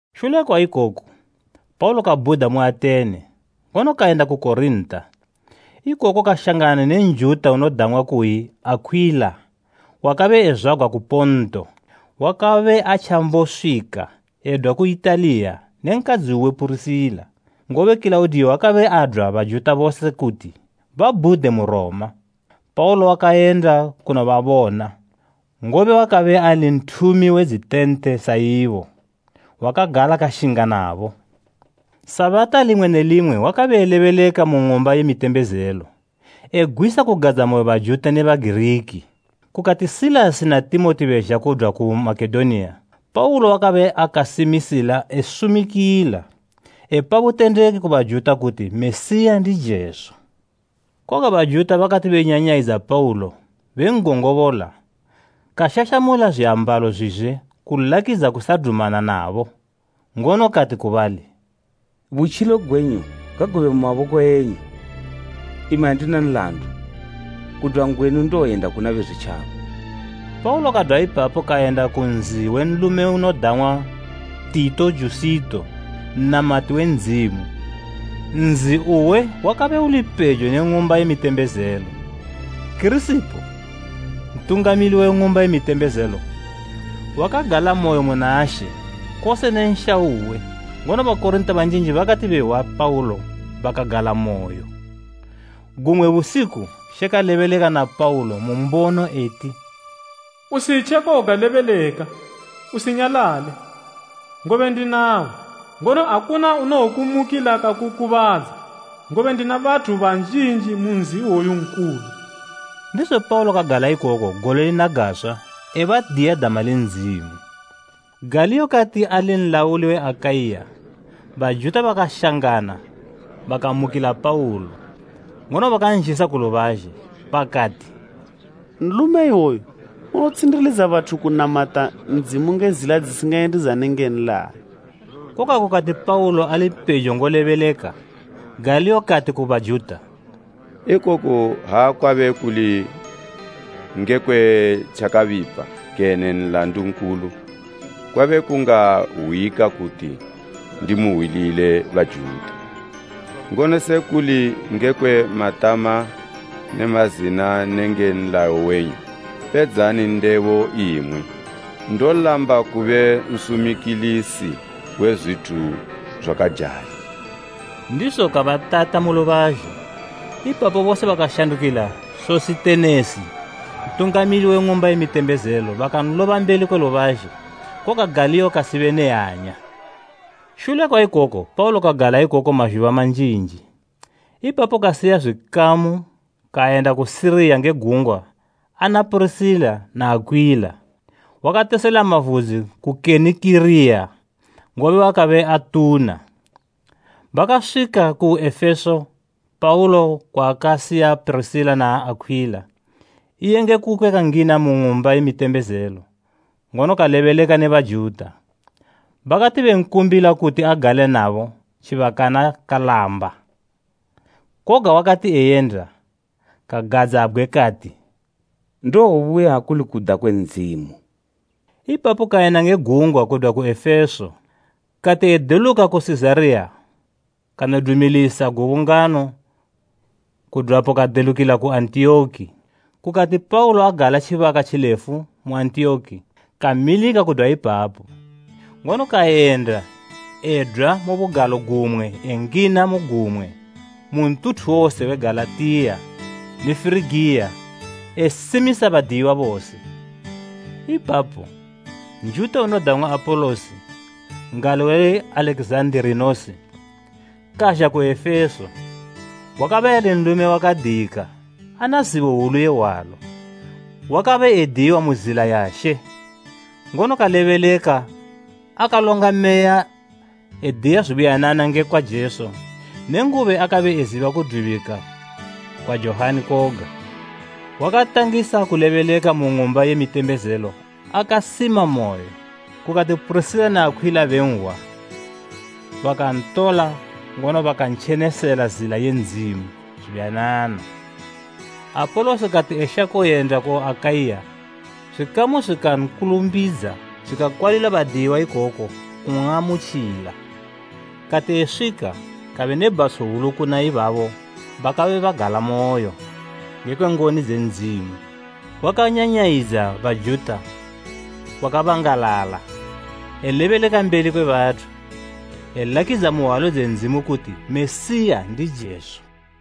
Shule kwa ikoku, Paulo kabhuda mu Atene, ngono kayenda ku Korinta. Ikoko kashangana ne Njuta unodang'wa kuyi Akhwila wakabe ezwagwa ku Ponto. Wakabe atjamboswika edwa ku Italiya ne nkadzi uwe Purisila, ngobe Kilaudiyo wakabe adwa Bajuta bose kuti babhude mu Roma. Paulo wakayenda kunobabona, ngobe wakabe ali nthumi we dzitente sa ibo, wakagala kashinga nabo. Sabata limwe ne limwe wakalebeleka mu ng'umba ye mitembezelo, egwisa kugadzamoyo Bajuta ne Bagiriki. Kukati Silasi na Timoti bezha bedwa ku Makedoniya, Paulo wakabe akasimisila esumikila, epa butendeki ku Bajuta kuti Mesiya ndi Jesu. Koga Bajuta bakati benyanyayidza Paulo ben'gongobola, kashashamula zwiambalo zwizwe kulakidza kusadumana nabo, ngono kati ku bali, “Butjilo gwenyu ngagube mu maboko enyu! Imi andina nlandu. Kudwa ngwenu ndowoyenda kuna Bezwitjaba.” Paulo kadwa ipapo kayenda ku nzi we nlume unodang'wa Tito Jusito nnamati we Ndzimu. Nzi uwe wakabe uli pejo ne ng'umba ye mitembezelo. Kirisipo, ntungamili we ng'umba ye mitembezelo wakagalamoyo muna She kose ne nsha uwe ngono Bakorinta banjinji bakati behwa Paulo bakagalamoyo. Gumwe busiku She kalebeleka na Paulo mu mbono eti, “Usitje koga lebeleka, usinyalale. Ngobe ndinawe, ngono akuna unowokumukila kakukubadza, ngobe ndina bathu banjinji mu nzi iwoyu nkulu.” Ndizo Paulo kagala ikoko gole lina gaswa ebadiya dama le Ndzimu. Galiyo kati ali nlauli we Akaiya, Bajuta bakashangana bakamukila Paulo, ngono bakanzhisa ku lubazhe. Bakati, “Nlume iwoyu unotshindilidza bathu kunamata Ndzimu nge zila dzisingayendidzane nge nlayo.” Koga kukati Paulo ali pejo ngolebeleka, Galiyo kati ku Bajuta, “Ikoku ha kwabe kuli ngekwe tjakabipa kene nlandu nkulu, kwabe kungahwika kuti ndimuhwilile Bajuta.” Ngono se kuli ngekwe matama ne mazina nenge nlayo wenyu, pedzani ndebo imwi. Ndolamba kube nsumikilisi we zwithu zwakajali. Ndizo kabatata mu lubazhe. Ipapo bose bakashandukila Sositenesi ntungamili we ng'umba ye mitembezelo bakanloba mbeli kwe lubazhe. Koga Galiyo kasibe ne hanya. Shule kwa ikoko Paulo kagala ikoko mazhuba manjinji. Ipapo kasiya zwikamu kayenda ku Siriya nge gungwa ana Purisila na Akhwila. Wakatesela mavudzi ku Kenikiriya, ngobe wakabe atuna. Bakaswika ku Efeso Paulo kwaakasiya Purisila na Akhwila. Iye nge kukwe kangina mu ng'umba ye mitembezelo, ngono kalebeleka ne Bajuta. Bakati benkumbila kuti agale nabo tjibakana kalamba. Koga wakati eyenda, kagadzabgwe kati, “Ndowobuya akuli kuda kwe Ndzimu.” Ipapo kayenda nge gungwa kudwa ku Efeso. Kati edeluka ku Sizariya, kanodumilisa gubungano kudwapo kadelukila ku Antiyoki. Kukati Paulo agala tjibaka tjilefu mu Antiyoki, kamilika kudwa ipapo, ngono kayenda edwa mu bugalo gumwe engina mu gumwe mu ntuthu wose we Galatiya ne Firigiya esimisa badiyiwa bose. Ipapo, Njuta unodang'wa Apolosi n'gali we Alekizanda, kazha ku Efeso. Wakabe ali nlume wakadiyika ana zibo hwulu ye hwalo. Wakabe adiyiwa mu zila ya She, ngono kalebeleka akalonga meya ediya zubuyanana ngekwa Jesu nenguba akabe eziba kudubika kwa Johani koga. Wakatangisa kulebeleka mu ng'umba ye mitembezelo akasimamoyo. Kukati Purisila na Akhwila benhwa, bakantola ngono bakantjenesela zila ye Ndzimu zubuyanana. Apolosi kati eshako yenda ku Akaiya, zwikamu zwikankulumbidza zwikakwalila badiyiwa ikoko kun'amutjila. Kati eswika, kabe ne bhatsho hwulu kuna ibabo bakabe bakagalamoyo nge ngoni dze Ndzimu. Wakanyanyayidza Bajuta kwakabangalala elebeleka mbeli kwe bathu, elakidza mu hwalo dze Ndzimu kuti Mesiya ndi Jesu.